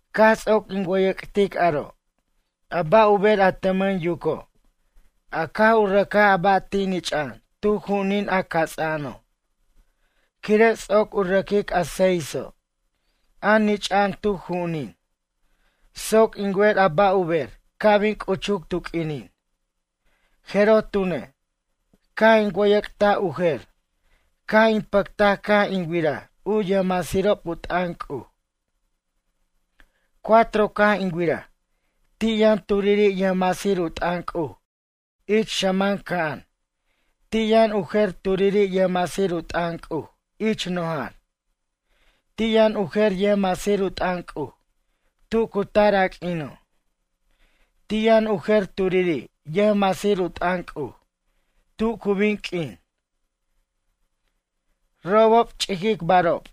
Caj ts'oc in wʌyʌc'tic aro', a ba' u ber a tʌmʌn yuco', a caj u rʌcaj a ba' nich'a'an tu ju'unin a cats'a'ano', quire' ts'oc u rʌquic a seiso', a nich'a'an tu ju'unin, soc in wer a ba' u ber ca' bin c'uchuc tu q'uinin. Jeroj tune', caj in wʌyʌc't u jer, caj in pʌctaj caj in wiraj u yʌjmasirob u t'ʌn C'uj. Cuatro caj in wiraj, ti' yʌn turiri' yʌjmasir u t'ʌn C'uj ich xʌman ca'an, ti' yʌn u jer turiri' yʌjmasir u t'ʌn C'uj ich nojar, ti' yʌn u jer yʌjmasir u t'ʌn C'uj tu cu tar a q'uino', ti' yʌn u jer turiri' yʌjmasir u t'ʌn C'uj tu cu bin q'uin. Robob ch'iquicbarob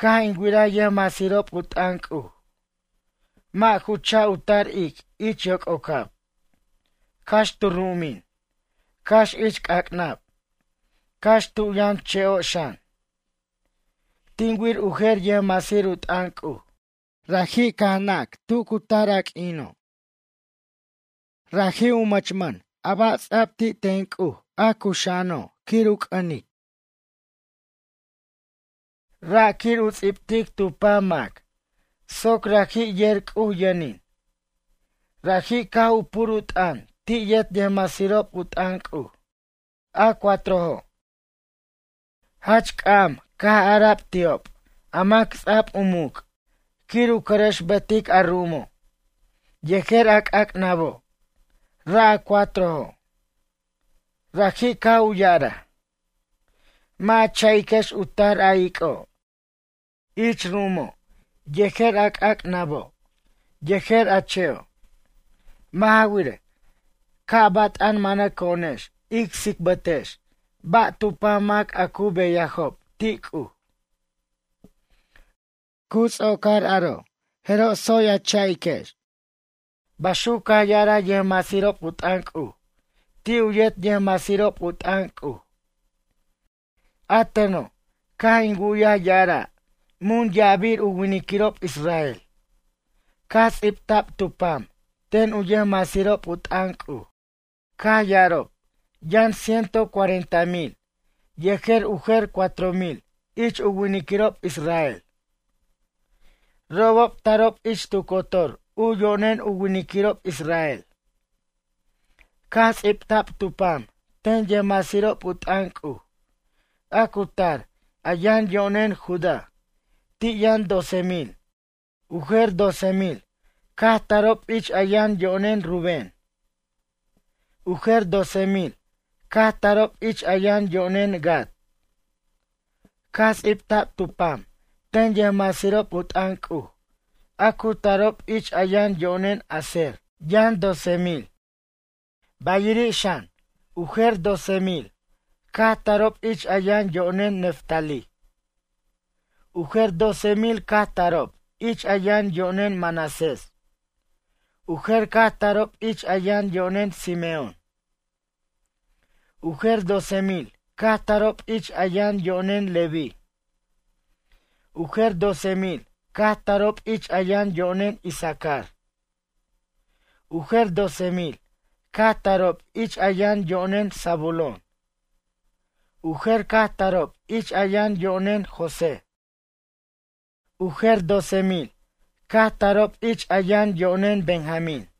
caj in wiraj yʌjmasirob u t'ʌn C'uj mʌ' ju cha' u tar ic' ich yoc'ocab, cax tu ru'umin, cax ich c'ac'nab, cax tu yʌn che'o' xan. Tin wir u jer yʌjmasir u t'ʌn C'uj, raji' caj u nac tu cu tar a q'uino'. Raji' u mʌchmʌn a ba' ts'a'b ti' ten C'uj, a cuxa'ano' quir u c'ʌnic. Ra' quir u ts'ibtic tu pam mac soc raji' yer C'uj yʌnin. Raji' caj u pur u t'ʌn ti' yet yʌjmasirob u t'ʌn C'uj, a cuatrojo'. Jach c'am caj ara'b ti'ob a mac ts'a'b u muc' quir u cʌrʌxbetic a ru'umo' yejer a c'ac'nabo', ra' a cuatrojo'. Raji' caj u ya'araj: ―Mʌ' a cha'iquex u tar a ic'o', ich ru'umo' yejer a c'ac'nabo' yejer a che'o'. Mʌ' ja wirej, ca' bat'an manʌco'onex ic ts'ibtex ba' tu pam mac a cu beyajob ti' C'uj. Cu ts'ocar aro, jeroj tsoy a cha'iquex. Baxuc caj ya'araj yʌjmasirob u t'ʌn C'uj ti' u yet yʌjmasirob u t'ʌn C'uj. A teno', caj in wu'yaj ya'ara' mun ya'abir u winiquirob israel caj ts'ibta'b tu pam ten u yʌjmasirob u t'ʌn C'uj. Caj ya'arob, yʌn ciento cuarenta mil yejer u jer cuatro mil ich u winiquirob israel. Robob tarob ich tu cotor u yo'nen u winiquirob israel. Caj ts'ibta'b tu pam ten yʌjmasirob u t'ʌn C'uj, a cu tar a yʌn yo'nen Judá, ti' yʌn doce mil. U jer doce mil caj tarob ich a yʌn yo'nen Rubén. U jer doce mil caj tarob ich a yʌn yo'nen Gad. Caj ts'ibta'b tu pam ten yʌjmasirob u t'ʌn C'uj a cu tarob, ich a yʌn yo'nen Aser, yʌn doce mil. Bayiri' xan, u jer doce mil caj tarob ich a yʌn yo'nen Neftalí. U jer doce mil caj tarob ich a yʌn yo'nen Manasés. U jer caj tarob ich a yʌn yo'nen Simeón. U jer doce mil caj tarob ich a yʌn yo'nen Leví. U jer doce mil caj tarob ich a yʌn yo'nen Isacar. U jer doce mil caj tarob ich a yʌn yo'nen Zabulón. U jer caj tarob ich a yʌn yo'nen José. U jer doce mil caj tarob ich a yʌn yo'nen Benjamín.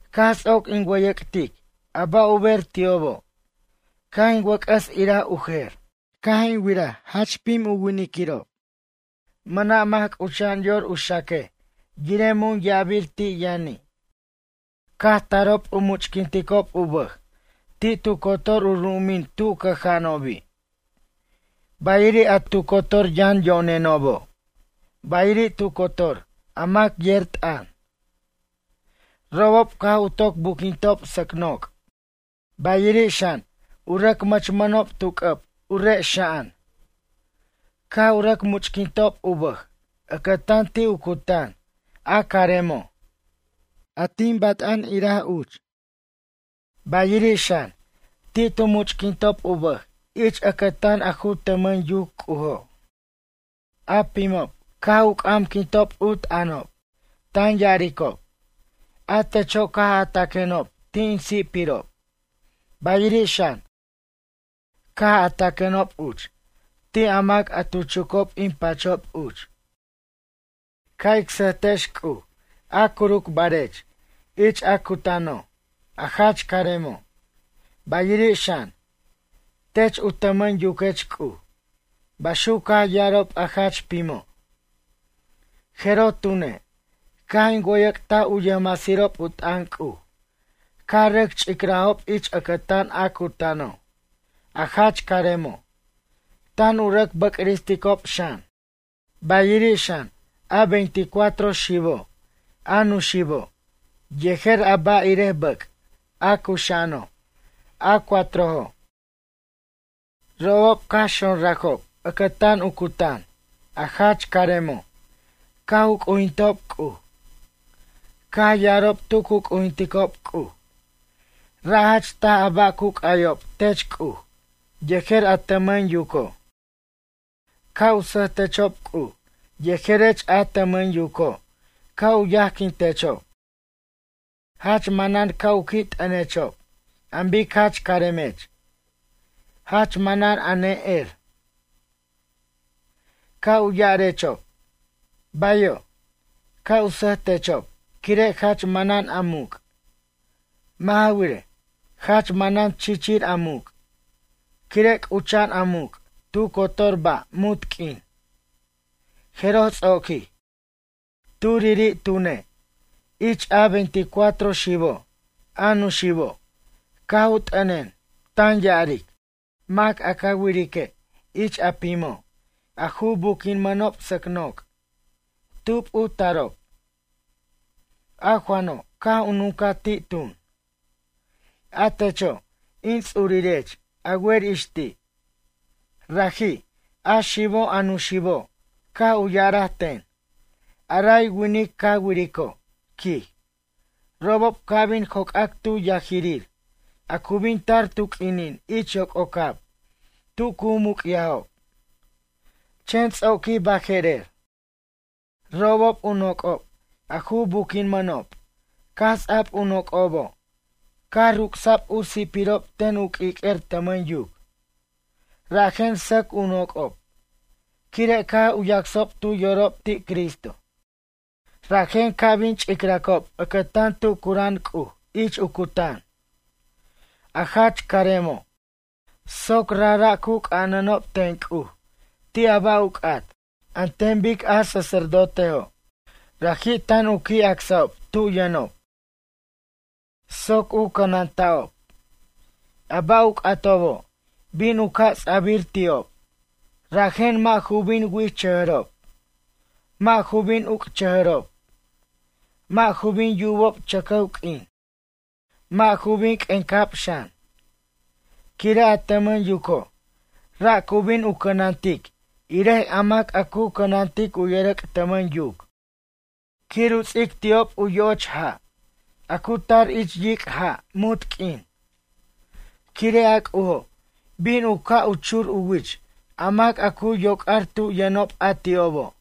Caj ts'oc in wʌyʌc'tic a ba' u ber ti'obo', caj in wʌc'ʌs iraj u jer. Caj in wiraj jach pim winiquirob. Mʌna' mac c'ucha'an yor u xaquej yirej mun ya'abir ti' yʌni'. Caj tarob u much'quinticob u bʌj ti' tu cotor u ru'umin tu cʌja'anobi'. Bayiri' a tu cotor yʌn yo'nenobo', bayiri' tu cotor a mac yer t'ʌn. Robob caj u toc buquintob sʌc noc', bayiri' xan, u rʌc mʌchmʌnob tu c'ʌb u re' xa'an. Caj u rʌc much'quintob u bʌj ʌcʌtan ti' u cutan, a caremo', a tin bat'an iraj uch, bayiri' xan, ti' tu much'quintob u bʌj ich ʌcʌtan a ju tʌmʌn yuc C'ujo'. A pimo', caj u c'amquintob u t'ʌnob, tan ya'aricob: A techo' caj a taquenob ti' in si'pirob, bayiri' xan, caj a taquenob uch ti' a mac a tu chucob in pachob uch. Ca' ic sʌjtechex C'uj a curucbarech ich a cutano', a jach caremo', bayiri' xan, tech u tʌmʌn yuquech C'uj. Baxuc caj yarob a jach pimo'. Jeroj tune', caj in wʌyʌc't u yʌjmasirob u t'ʌn C'uj, caj rʌc ch'icrajob ich ʌcʌtan a cutano', a jach caremo' tan u rʌc bʌcristicob xan. Bayiri' xan, a veinticuatro xibo', a nuxibo', yejer a ba' irej bʌc' a cuxa'ano', a cuatrojo'. Robob caj xonrajob ʌcʌtan u cutan, a jach caremo' caj u c'ujintob C'uj. Caj ya'arob tu tu c'ujinticob C'uj: Ra' jach taj a ba' cu c'ʌyob tech C'uj yejer a tʌmʌn yuco'. Ca' u sʌjtechob C'uj yejerech a tʌmʌn yuco' ca' u yajquintechob. Jach manan ca' u qui' t'ʌnechob an bic jach caremech. Jach manan a ne'er. Ca' u ya'arechob: “Bayo'.” Ca' u sʌjtechob quire' jach manan a muc'. Mʌ' ja wirej, jach manan chichir a muc', quire' c'ucha'an a muc' tu cotor ba' munt q'uin. Jeroj ts'oquij. Turiri' tune', ich a veinticuatro xibo', a nuxibo', caj u t'ʌnen, tan ya'aric: ―Mac a ca wirique' ich a pimo' a ju buquimʌnob sʌc noc'. Tub u tarob? A Juano' caj u nuncaj ti' tun: ―A techo', in ts'urirech a wer ix ti'. Raji', a xibo' a nuxibo' caj u ya'araj ten: ―A ray winic ca wirico' ―quij―, robob ca' bin joc'ac tu yajirir a cu bin tar tu q'uinin ich yoc'ocab tu cu muc'yajob, chen ts'oquij baje'rer. Robob u noc'ob, a ju buquimʌnob caj ts'ab u noc'obo' caj ruc'sa'b u si'pirob ten u q'uiq'uer tʌmʌn yuc. Rajen sʌc u noc'ob quire' caj u yacsob tu yorob ti' Cristo. Rajen ca' bin ch'icracob ʌcʌtan tu cura'an C'uj ich u cutan, a jach caremo', soc rajra' u c'anʌnob ten C'uj ti' a ba' u c'at, an ten bic a sacerdotejo'. Raji' tan u qui' acsa'ob tu yʌno' soc u cʌnanta'ob. A ba' u c'atobo' bin u ca' ts'abʌr ti'ob, rajen mʌ' ju bin wichʌjʌrob, mʌ' ju bin uc'chʌjʌrob, mʌ' ju bin yubob chʌcʌw q'uin, mʌ' ju bin q'uic'ab xan. Quire' a tʌmʌn yuco', ra' cu bin u cʌnantic irej a mac a cu cʌnantic u yʌrʌc' tʌmʌn yuc quir u ts'ic ti'ob u yo'och ja', a cu tar ich yic' ja' munt q'uin. Quire' a C'ujo' bin u ca' u chur u wich a mac a cu yoc'ar tu yʌnob a ti'obo'.